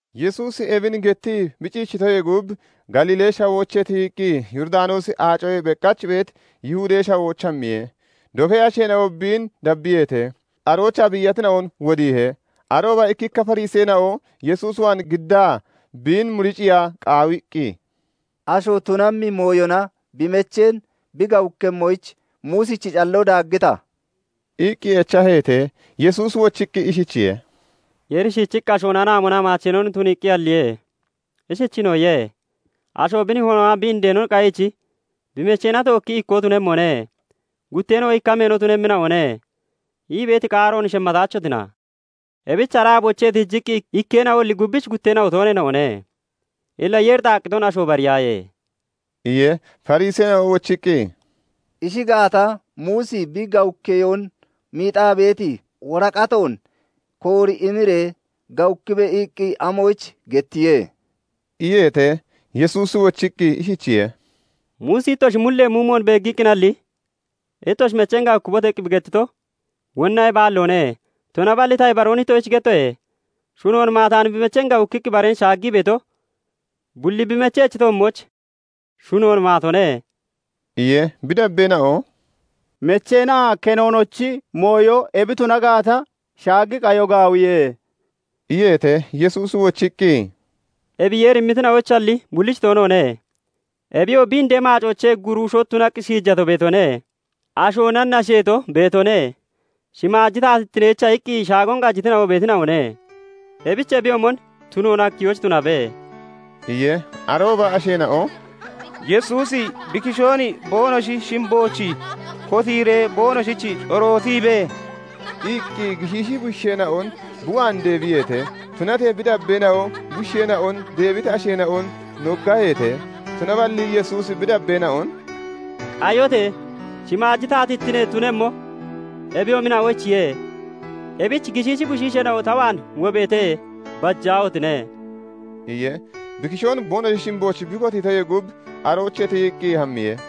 Yesuusi ebin gettii bi ciichitoyee gub, Galiilee Shawoochee tiyiqqi Yooridanoosi Aacoyee beqach beeti Yihudee Shawooch hammiye. Dofee asheena'o biin dabbiyeete; aroochaa biiyatina'on wodiihe. Arooba ikkikka Fariseena'o Yesuus waan giddaa biin muriciiya qaawiqqi, "Asho tunammi mooyona bi mecheen bi gawukkemmoyich Muusichi calloo daaggita?" iqqi echaheete. Yesuusi wochiqqi ishichiye:- "Yeeri shiichiqqi ashoon anaamonaa maacheenon tuniiqqi halliye. Ishichiinoo iye:- 'Asho bi nihoonaa bi indeenon qayiichi bi mecheena tookki ikkoo tunemmone; gutteena'oo ikka meeno tunemmina'one' ii beeti qaaroon shemmataachotina? Ebich ara aaboochee tiijiqqii ikkeena'oalli gubbichi gutteena'o tooneena'one. Illa Yeeri xaaqqiton, asho bariyaaye" iye. Fariseena'o wochiqqi, "Ishi gaata, Muusi 'Bi gawukkeyoon miixaa beeti woraqatoon koori imiree gawukkibe' iqqi amoyich gettiye?" iyeete. Yesuusi wochiqqi ishichiye:- "Muusi ittoshi mullee muumoon beeggiqqinalli 'Ittoshi mecheen gawukkibote!' iqqi bi gettito; wonna ebi aalloone. Tunaballi ta ibaroon ittoshich gettoye; shunoon maataani bi mecheen gawukkiqqi bareen shaaggii beeto bulli bi mechechi toommooch shunoon maatone" iye. Bi dabbeena'o "Mecheenaa kenoonochi mooyo ebi tuna gaata, shaagi qayo gaawiye" iyeete. Yesuusi wochiqqi, "Ebi Yeeri immitina'oyichalli bullich toonoone; Ebiyoo bi indee maacoochee guruusho tunaqqi shiijato beetone; ashoona nasheeto beetone; shimaaji taatittineyicha iqqi shaagon qajitina'o beetina'one. Ebich ebiyoomon tunoon hakkiyoyich tunabe" iye. Arooba asheena'o "Yesuusi bi kishoon boonoshi shimbooch kotiiree boonoshich corootibe" iqqi gishiishi bushiisheena'on bi waan deebiyeete; tunatee bi dabbeena'o bushiisheena'on deebiti asheena'on noggaheete. Tunaballi Yesuusi bi dabbeena'on " Qayote! Shimaaji taatittine tunemmo eboyoomina'oyichiye; ebichi gishiishi bushiisheena'o ta waan wobeete; bajaahotine" iye. Bi kishoon boonoshi shimbooch bi kotiitoyee gub aroochee tiyiqqi hammiye.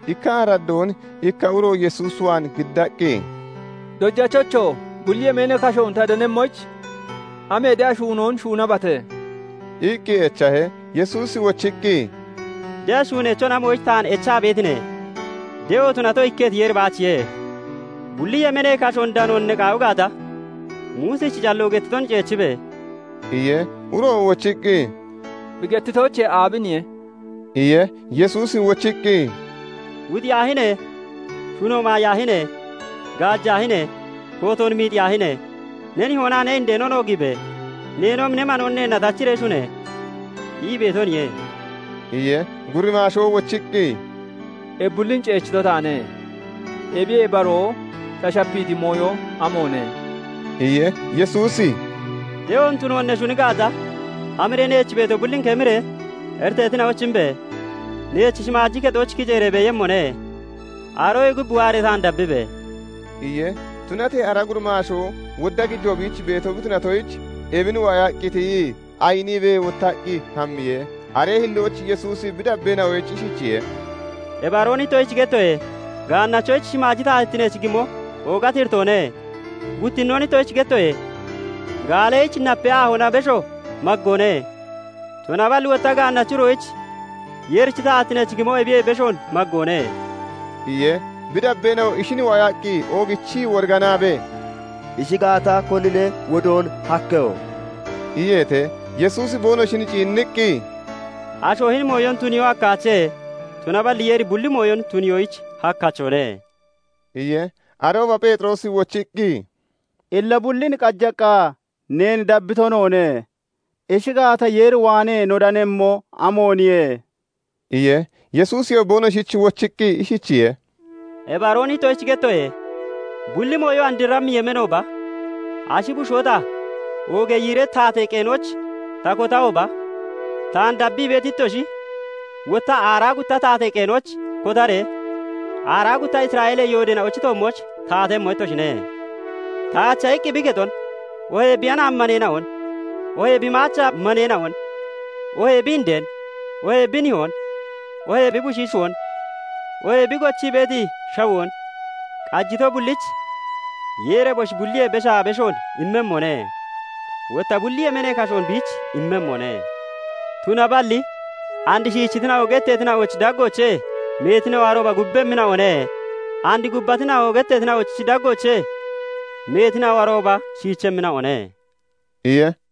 Ikka araddoon ikka uro Yesuus waan giddaqqi, "Dojachocho! Bulli yemeenee kashoon ta danemmoyich amee de'a shuunoon shuunabate?" iqqi echahe. Yesuusi wochiqqi, "De'a shuuneechon amoyich taan echa beetine? De'o tunato ikketi Yeeri baachiye. Bulli yemeenee kashoon danoon ne qaawi gaata, Muusichi calloo gettiton ceechibe!" iye. Uroo wochiqqi, "Bi gettitoochee aabiniye?" iye. Yesuusi wochiqqi, " 'Wuxiyaahine! Shuno maayaahine! Gaajaahine! Kootoon miixiyaahine! Ne nihoonaa ne indeenon oogiibe! Neenoomi ne manoon neenna tachiree shune!' ii beetoniye" iye. Gurimaashoo wochiqqi, "Ebi bullin ceechito taane. Ebiye baroo ta shapiiti mooyo amoone?" iye. Yesuusi "De'oon tuno ne shuni gaata, hamiree neech beeto bullin kemiree iriteetina'oyich imbe! Neech shimaaji kexooch kiceeree beeyemmone. Aroyee gub waaree taan dabbibe!" iye. Tunatee ara gurimaashoo wodda gijoo biich beeto bi tunatoyich, ebin waayaqqi tiyii ayiniibee wottaqqi hammiye. Aree hillooch Yesuusi bi dabbeena'oyich ishichiye:- "Ibaroon ittoshich gettoye; gaannachoyich shimaaji taatittineech gimo oogati iritoone. Guttinoon ittoshich gettoye; gaalleyich napee aahoona besho maggoone; tunaballi wotta gaannachi uroyich Yeerichi taatittineech gimo ebiyee beshoon maggoone" iye. Bi dabbeena'o ishin waayaqqi oogichii woriganaabee, "Ishi gaata, konine wodoon hakkeho?" iyeete. Yesuusi boonoshin ciinniqqi, "Asho hini mooyon tuniyoo hakkaache; tunaballi Yeeri bulli mooyon tuniyoyich hakkachone" iye. Arooba Pheexiroosi wochiqqi, "Illa bullin qajaqqa neen dabbito noone. Ishi gaata, Yeer waanee no danemmo amooniye?" iye. Yesuusiyoo boonoshich wochiqqi ishichiye:- "Ibaroon ittoshich gettoye; bulli mooyo andrammi yemeenooba ashi bushoo ta oogee yiiree taatee qeenooch ta kotahooba, taan dabbii beeti ittoshi wotta aaraa gutta taatee qeenooch kotaree aaraa gutta Isra'eelee yoodeena'ochi toommooch taatemmo ittoshine. Taacha iqqi bi kexon, oohee bi anaami maneena'on, oohee bi maacha maneena'on, oohee bi indeen, oohee bi nihoon, oohee bi bushiishoon, oohee bi gochii beeti shawoon qajito bullich Yeeri eboshi bulliyee beshaa beshoon immemmone; wotta bulli yemeenee kashoon biich immemmone. Tunaballi and 'Shiichitina'o' getteetina'ochi daggoochee meetina'o arooba gubbemmina'one; and 'gubbatina'o' getteetina'ochi daggoochee meetina'o arooba shiichemmina'one" iye.